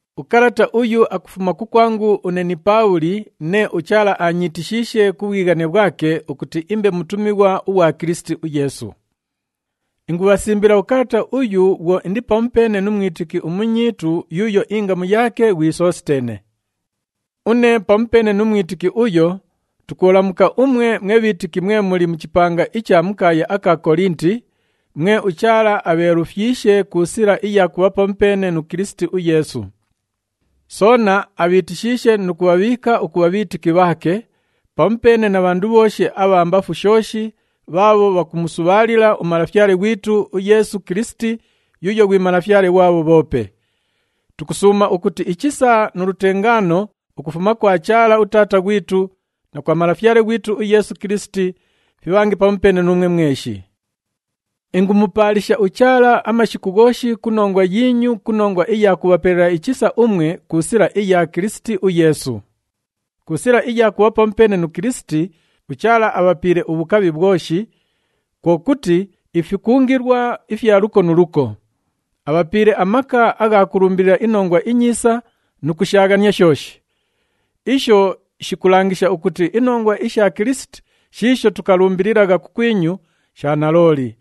Ukalata uyu akufuma kukwangu une ni Paabhuli, nee uChaala aanyiitishiishe ku bhwighane bhwake ukuti imbe mutumighwa ughwa Kilisiti uYeesu. Ingubhasimbila ukalata uyu bhwo indi pamupeene nu mwitiki umunyiitu yuuyo ingamu yaake ghwi Sositeene. Une pamupeene nu mwitiki uyo, tukubhalamuka umwe mwe bhiitiki mwe muli mu chipanga icha mu kaaya aka Kolinti, mwe uChaala abheelufyishe ku sila iya kubha pamupeene nu Kilisiti uYeesu. Soona abhiitishiishe nu kubhabhiika ukubha bhiitiki bhaake, pamupeene na bhandu bhooshi abha mbafu shooshi bhaabho bhakumusubhaalila uMalafyale ghwitu uYeesu Kilisiti yuuyo ghwi Malafyale ghwabho bhoope. Tukusuuma ukuti ichisa nu lutengaano ukufuma kwa Chaala uTaata ghwitu na kwa Malafyale ghwitu uYeesu Kilisiti fibhange pamupeene nuumwe mweshi. Ingumupaalisha uChaala amashiku ghooshi ku nongwa yiinyu ku nongwa iya kubhapelela ichisa umwe ku sila iya Kilisiti uYeesu. Ku sila iya kubha pamupeene nu Kilisiti, uChaala abhapiile ubhukabhi bhwoshi, kwo kuti ifikungilwa ifya luko nu luko. Abhapiile amaka agha kulumbilila iNongwa iNyiisa nu kushaaghania shooshi. Isho shikulangisha ukuti inongwa isha Kilisiti shiisho tukalumbililagha kukwinyu, sha nalooli.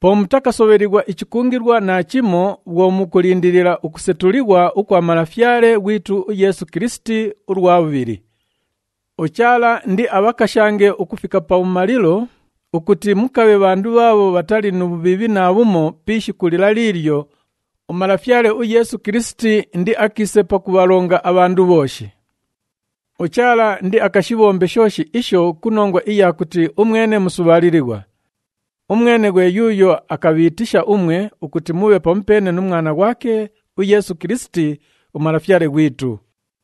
Po mutakasobhelighwa ichikungilwa naachimo bhwo mukulindilila ukusetulighwa ukwa Malafyale ghwitu uYeesu Kilisiti ulwa bhubhili. UChaala indiabhakashange ukufika pabhumalilo ukuti mukabhe bhandu bhaabho bhatali nu bhubhiibhi naabhumo pi ishiku lila liilyo uMalafyale uYeesu Kilisiti indiakiise pakubhalonga abhandu bhooshi. UChaala indiakashibhombe shooshi isho ku nongwa iya kuti umwene musubhaalilighwa. Umwene ghwe yuuyo akabhiitisha umwe ukuti mubhe pamupeene nu Mwana ghwake uYeesu Kilisiti, uMalafyale ghwitu.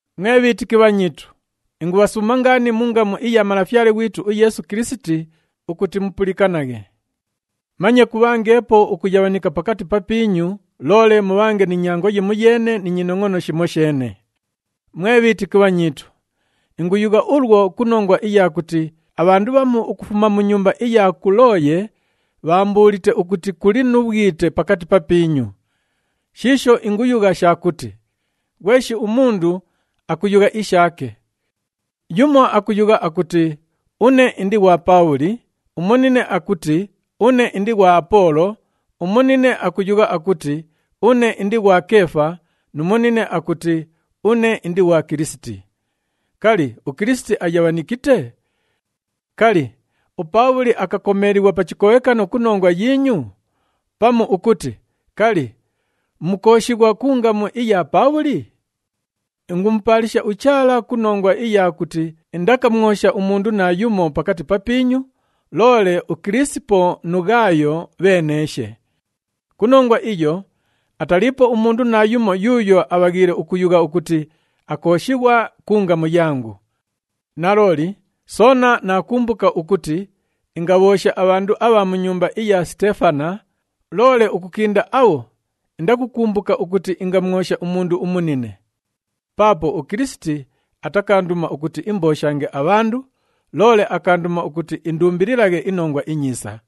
Mwe bhiitiki bhanyiitu, ingubhasuuma ngaani mu ngamu iya Malafyale ghwitu uYeesu Kilisiti ukuti mupulikanaghe. Manye kubhangeepo ukuyabhanika pakati papiinyu, loole mubhange ni nyango yimoyeene ni nyinongʼono shimosheene. Mwe bhiitiki bhanyiitu, inguyugha ulwo ku nongwa iya kuti abhandu bhamu ukufuma mu nyumba iya Kulooye bhaambuulite ukuti kuli nu bhwite pakati papiinyu. Shiisho inguyugha sha kuti, ghweshi umundu akuyugha ishaake. Yumo akuyugha akuti, “Une indi ghwa Paabhuli,” umunine akuti, “Une indi ghwa Apoolo,” umunine akuyugha akuti, “Une indi ghwa Keefa,” nu munine akuti, “Une indi ghwa Kilisiti.” Kali, uKilisiti ayabhanikite? Kali, uPaabhuli akakomeelighwa pa chikobhekano ku nongwa yiinyu? Pamu ukuti, kali, mukooshighwa ku ngamu iya Paabhuli? Ingumupaalisha uChaala ku nongwa iya kuti indakamwosha umundu naayumo pakati papiinyu, loole uKilisipo nu Ghaayo bheeneeshe. Ku nongwa iyo, ataliipo umundu naayumo yuuyo abhaghiile ukuyugha ukuti akooshighwa ku ngamu yangu. Nalooli, soona naakumbuka ukuti ingabhoosha abhandu abha mu nyumba iya Siteefana, loole ukukinda abho indakukumbuka ukuti ingamwosha umundu umunine. Paapo uKilisiti atakaanduma ukuti imbooshange abhandu, loole akaanduma ukuti indumbililaghe iNongwa iNyiisa.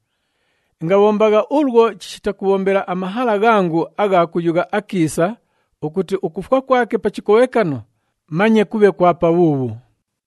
Ingabhombagha ulwo chishita kubhombela amahala ghangu agha kuyugha akiisa ukuti ukufwa kwake pa chikobhekano manye kubhe kwa pabhuubhu.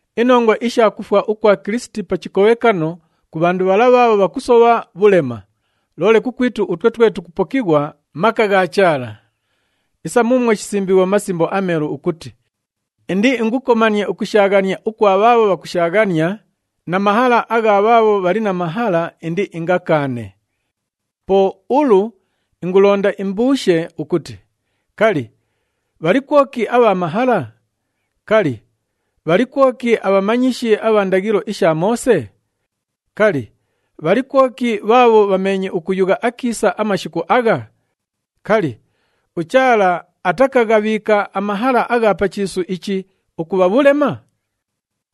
Inongwa isha kufwa ukwa Kilisiti pa chikobhekano ku bhandu bhala bhaabho bhakusobha, bhulema, loole kukwitu utwe twe tukupokighwa, maka gha Chaala. Isa muumwo shisimbiighwe mu Masimbo aMeelu ukuti, “Indiingukomanie ukushaaghania ukwa bhaabho bhakushaaghania, na mahala agha bhaabho bhali na mahala, indiingakaane.” Po ulu ingulonda imbabhuushe ukuti, kali, bhali kwoki abha mahala? Kali, bhali kwoki abhamanyishi abha ndaghilo isha Moose? Kali, bhali kwoki bhaabho bhameenye ukuyugha akiisa amashiku agha? Kali, uChaala atakaghabhiika amahala agha pa chiisu ichi ukubha bhulema?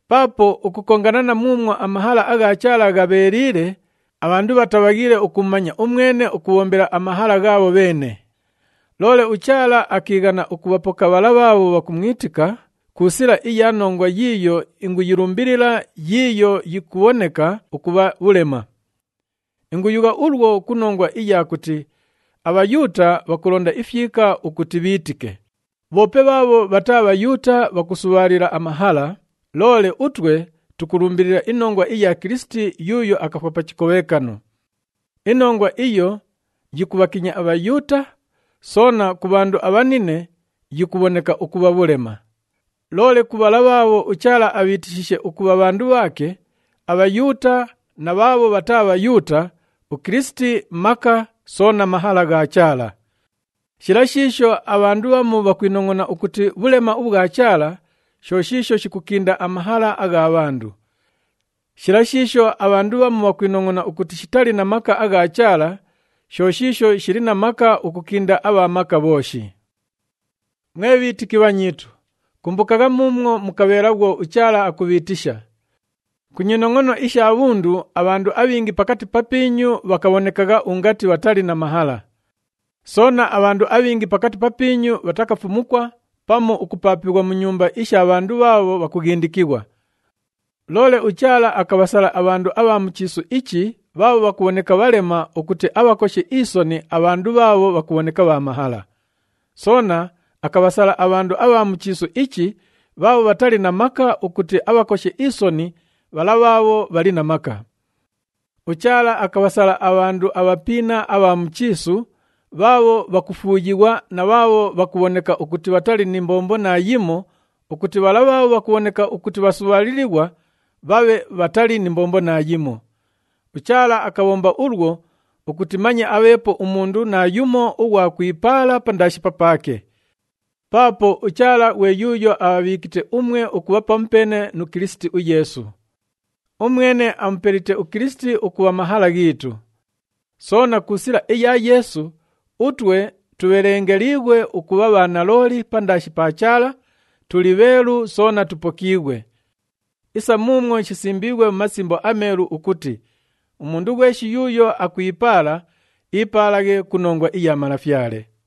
Paapo ukukongana na muumwo amahala agha Chaala ghabheeliile, abhandu bhatabhaghiile ukumumanya umwene ukubhombela amahala ghaabho bheene. Loole uChaala akiighana ukubhapoka bhala bhaabho bhakumwitika ku sila iya nongwa yiiyo inguyilumbilila yiiyo yikubhoneka ukubha bhulema. Inguyugha ulwo ku nongwa iya kuti aBhayuuta bhakulonda ifyika ukuti bhiitike, bhoope bhaabho bhataa Bhayuuta bhakusubhaalila amahala, loole utwe tukulumbilila inongwa iya Kilisiti yuuyo akafwa pa chikobhekano. Inongwa iyo yikubhakinya aBhayuuta, soona ku bhandu abhanine yikubhoneka ukubha bhulema. Loole ku bhala bhaabho uChaala abhiitishiishe ukubha bhandu bhaake, aBhayuuta na bhaabho bhataa Bhayuuta, uKilisiti maka soona mahala gha Chaala. Shila shiisho abhandu bhamu bhakwinongʼona ukuti bhulema ubhwa Chaala, sho shiisho shikukinda amahala agha bhandu. Shila shiisho abhandu bhamu bhakwinongʼona ukuti shitali na maka agha Chaala, sho shiisho shili na maka ukukinda abha maka bhooshi. Mwe bhiitiki bhanyiitu, kumbukagha muumwo mukabheela bhwo uChaala akubhiitisha. Ku nyinongʼono isha bhundu, abhandu abhingi pakati papiinyu bhakabhonekagha ungati bhatali na mahala. Soona, abhandu abhingi pakati papiinyu bhatakafumukwa pamu ukupaapighwa mu nyumba isha bhandu bhaabho bhakughindikighwa. Loole uChaala akabhasala abhandu abha mu chiisu ichi bhaabho bhakubhoneka bhalema ukuti abhakoshe isoni abhandu bhaabho bhakubhoneka bha mahala. Soona akabhasala abhandu abha mu chiisu ichi bhaabho bhatali na maka ukuti abhakoshe isoni bhala bhaabho bhali na maka. UChaala akabhasala abhandu abhapiina abha mu chiisu, bhaabho bhakufuuyighwa na bhaabho bhakubhoneka ukuti bhatali ni mbombo naayimo ukuti bhala bhaabho bhakubhoneka ukuti bhasubhaalilighwa bhabhe bhatali ni mbombo naayimo. UChaala akabhomba ulwo ukuti manye abheepo umundu naayumo ughwa kwipaala pandaashi papaake. Paapo uChaala ghwe yuuyo abhabhiikite umwe ukubha pamupeene nu Kilisiti uYeesu. Umwene amupelite uKilisiti ukubha mahala ghiitu. Soona ku sila iya Yeesu, utwe tubhelengelighwe ukubha bhanalooli pandaashi pa Chaala, tuli bheelu soona tupokiighwe. Isa muumwo shisimbiighwe mu Masimbo aMeelu ukuti, “Umundu ghweshi yuuyo akwipaala, iipaalaghe ku nongwa iya Malafyale.”